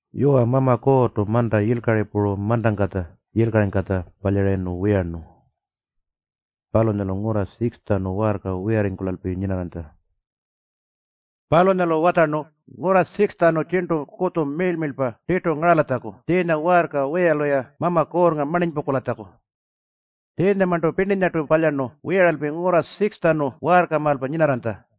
Yuwa, Mama Kuurrtu manta yilkari puru mantangkatja yilkaringkatja palyarayirnu wiyarnu. Palunyalu ngurra 6-tjanu waarka wiyarringkulalpi nyinarranytja. Palunyalu watjarnu ngurra 6-tjanu tjirntu kutju miirl-miirlpa tirtu ngaralatjaku tjiinya waarka wiyalu-ya Mama Kuurrnga marninypungkulatjaku. Tjiinyamarntu pirninyartu palyarnu wiyaralpi ngurra 6-tjanu waarkamaalpa nyinarranytja.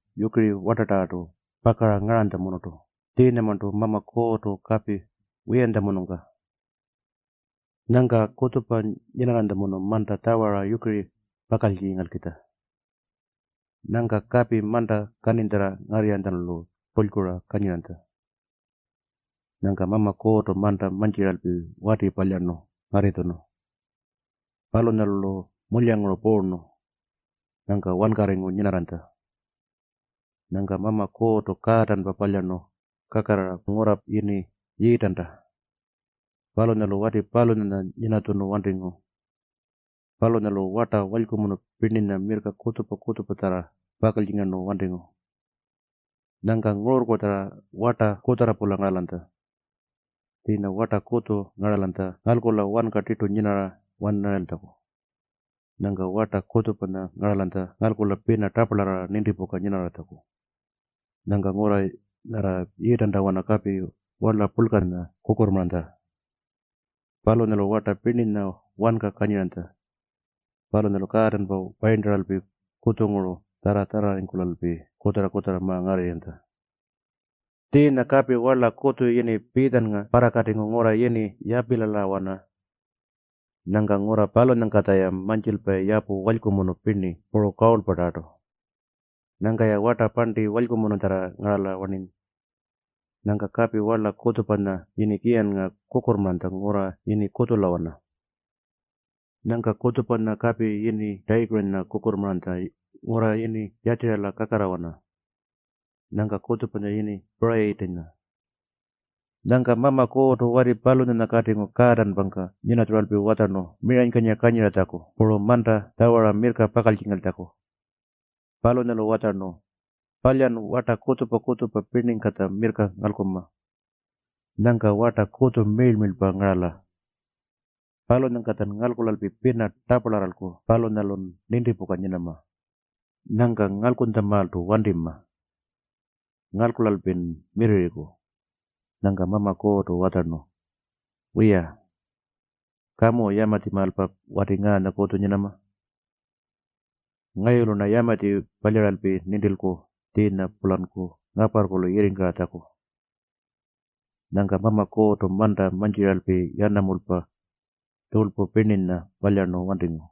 yukiri wartatarrartu pakara ngaranytjamunurtu tjiinyamarntu Mama Kuurrtu kapi wiyantjamunungka. Nyangka kutjupa nyinanytjamunurtu manta tjawara yukiri pakaltjingalkitja. Nyangka kapi manta kaninytjarra ngarrirranytjalu tulykura kanyiranytja. Nyangka Mama Kuurrtu manta mantjiralpi wati palyarnu ngarritjunu. Palunyalu-lu mulyanguru puurnu. Nyangka wankarringu nyinarranytja. Nyangka Mama Kuurrtu kaatanpa palyarnu kakarrara, ngurra yini Yiitanta. Palunyalu wati palunyanya nyinatjunu wantingu. Palunyalu warta walykumunu pirninya mirrka kutjupa-kutjupatjarra pakaltjingarnu wantingu. Nyangka ngururrkutjarra warta kutjarra-pula ngaralanytja. Tjiinya warta kutju ngaralanytja ngalkula wanka tirtu nyinarra-wanarayiltjaku. Nyangka warta kutjupanya ngaralanytja ngalkula pina taparlarrara nintipuka nyinarratjaku. Nyangka ngurra nyarra Yiitantawana kapi warla purlkanya kukurrmaranytja. Palunyalu warta pirninya wanka kanyiranytja. Palunyalu kaatanpa wayirntaralpi kutjunguru tjarra-tjarrarringkulalpi kutjarra-kutjarra ma-ngarrirranytja. Tjiinya kapi warla kutju yini Piitjannga parrakatingu ngurra yini Yapilalawana. Nyangka ngurra palunyangkatja-ya mantjilpayi yapu walykumunu pirni puru kawurlpatarrartu. Nyangka-ya warta parnti walykumunutjarra ngarala-warni. Nyangka kapi warla kutjupanya yini Kiyannga kukurrmaranytja ngurra yini Kuutjulawana. Nyangka kutjupanya kapi yini Tayikurinya kukurrmaranytja ngurra yini Yatjiriyala kakarrarawana. Nyangka kutjupanya yini Purayitinya. Nyangka Mama Kuurrtu wati palunyanya katingu kaatanpangka nyinatjuralpi watjarnu miranykanyira kanyiratjaku puru manta tjawara mirrka pakaltjingaltjaku. Palunyalu watjarnu, “Palyan warta kutjupa-kutjupa pirningkatja mirrka ngalkunma. Nyangka warta kutju miirl-miirlpa ngarala. Palunyangkatjan ngalkulalpi pina taparlarralku palunyalun nintipuka nyinama. Nyangka ngalkunytjamaaltu wantima. Ngalkulalpin mirrirriku.” Nyangka Mama Kuurrtu watjarnu, “Wiya, kamu yamatjimaalpa wati ngaanya kutju nyinama. Ngayulu-rna yamatji palyaralpi nintilku tjiinya-pulanku ngaparrkulu yirringkaratjaku.” Nyangka Mama Kuurrtu manta mantjiralpi yanamulpa, puru tjurlpu pirninyatarrartu palyarnu wantingu.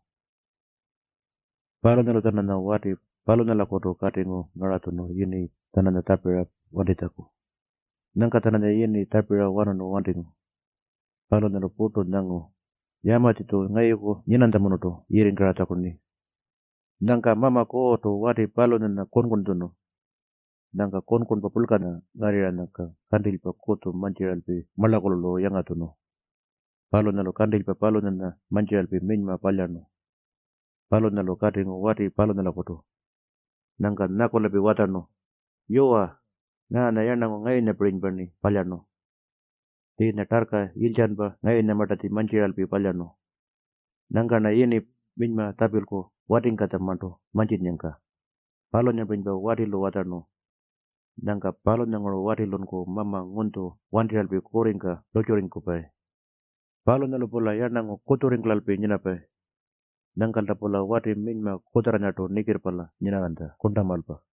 Palunyalu-tjananya wati palunyakutu katingu ngaratjunu yini-tjananya tjapiratjaku. Nyangka-tjananya yini tjapira-wanarnu wantingu. Palunyalu purtu nyangu, “Yamatji-tju ngayuku nyinanytjamunurtu yirringkaratjaku-rni.” Nyangka Mama Kuurrtu wati palunyanya kunkuntjunu. Nyangka kunkunpa purlkanya ngarrirranyangka kantilypa kutju mantjiralpi marlakulu-lu yangatjunu. Palunyalu kantilypa palunyanya mantjiralpi minyma palyarnu. Palunyalu katingu wati palunyakutu. Nyangka nyakulalpi watjarnu, “Yuwa, ngaanya yarnangu ngayunyapirinypa-rni palyarnu. Tjiinya tarrka yilytjanpa ngayunyamartatji mantjiralpi palyarnu. Nyangka-rna yini minyma tjapilku watingkatjamarntu mantjinnyangka.” Palunyapirinypa watilu watjarnu. Nyangka palunyanguru watilunku mama ngunytju wantirralpi kurringka lurrtjurringkupayi. Palunyalu-pula yarnangu kutjurringkulalpi nyinapayi. Nyangkalta-pula wati minyma kutjarranyartu nikirrpalya nyinarranytja kurntamaalpa.